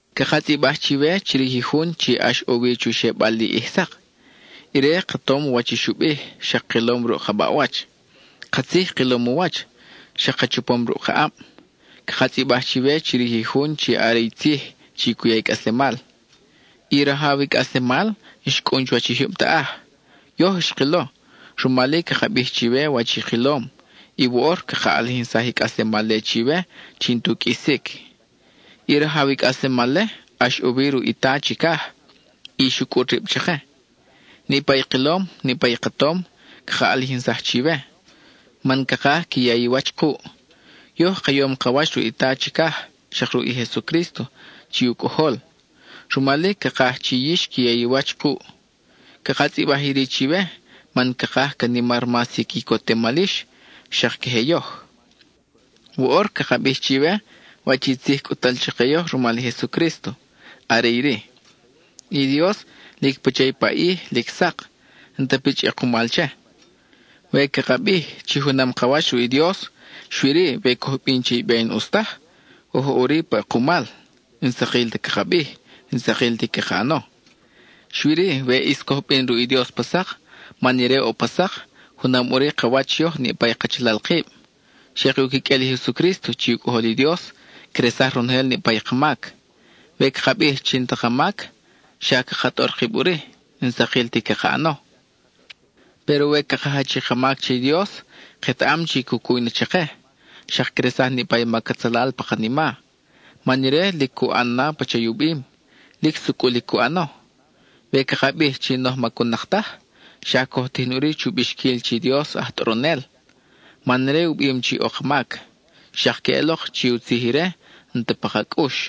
Caka tzʼibaj chiwe chirij i Jun chi ʼax ʼo wi chu xebal li ʼij sak. Ire, ka tom wach i xu bij, xak kilom ruʼ ka baʼwach; katzij kilom u wach, xak ka chapom ruʼ ka ʼab. Caka tzʼibaj chiwe chirij i Jun chi are i Tzij chi cu ya i cʼaslemal. I Rajaw i cʼaslemal xcʼun chuwach i jyub taʼaj; yoj xkilo, rumal-i caka bij chiwe wach i kilom, y woʼor caka ʼalijinsaj i cʼaslemal-le chiwe chi n-tu qʼuisic. I Rajaw i cʼaslemal-le ʼax ʼo wi ruʼ i Ta chicaj, y xu cʼut rib chake. Niʼpa i kilom, niʼpa i ka tom, caka ʼalijinsaj chiwe, man cakaj qui ya i wach kuʼ. Yoj ka yom ka wach ruʼ i Ta chicaj, xak ruʼ i Jesucrísto chi u Cʼojol; rumal-i, cakaj chi yix qui ya i wach kuʼ. Caka tzʼibaj iri chiwe, man cakaj ca nimar mas i quicotemal yix, xak queje yoj. Woʼor caka bij chiwe wach i tzij cʼut-tal chake yoj rumal i Jesucrísto; are iri: i Dios, lic pacha i paʼij lic sak, n-ta pichʼ ʼekumal che. We caka bij chi junam i ka wach ruʼ i Dios, xui-ri we coj bin che i be n-ʼus taj, oj ʼo ʼuri pa ʼekumal, n-sakil ti caka bij, n-sakil ti caka ʼano. Xui-ri, we ʼis coj bin ruʼ i Dios pa sak, man ire ʼo pa sak, junam ʼuri ka wach yoj niʼpa i kachalal kib; xak i u quiqʼuel i Jesucrísto chi u Cʼojol i Dios, cresaj ronojel niʼpa i ka mac. We caka bij chi n-ta ka mac, xa caka tʼor kib ʼuri; n-sakil ti caka ʼano. Péro we caka jach i ka mac che i Dios, ketaʼam chi cu cuy na chake, xak cresaj niʼpa i mac atzalal pa kanima. Man ire lic cu ʼan na pacha i u bim; lic sucʼul i cu ʼano. We caka bij chi n-oj macun-nak taj, xa coj tijin ʼuri chu bixquil chi Dios aj tʼoronel (man ire u bim chi ʼo ka mac); xak queʼelok chi u tzij ire n-ta pa ka cʼux.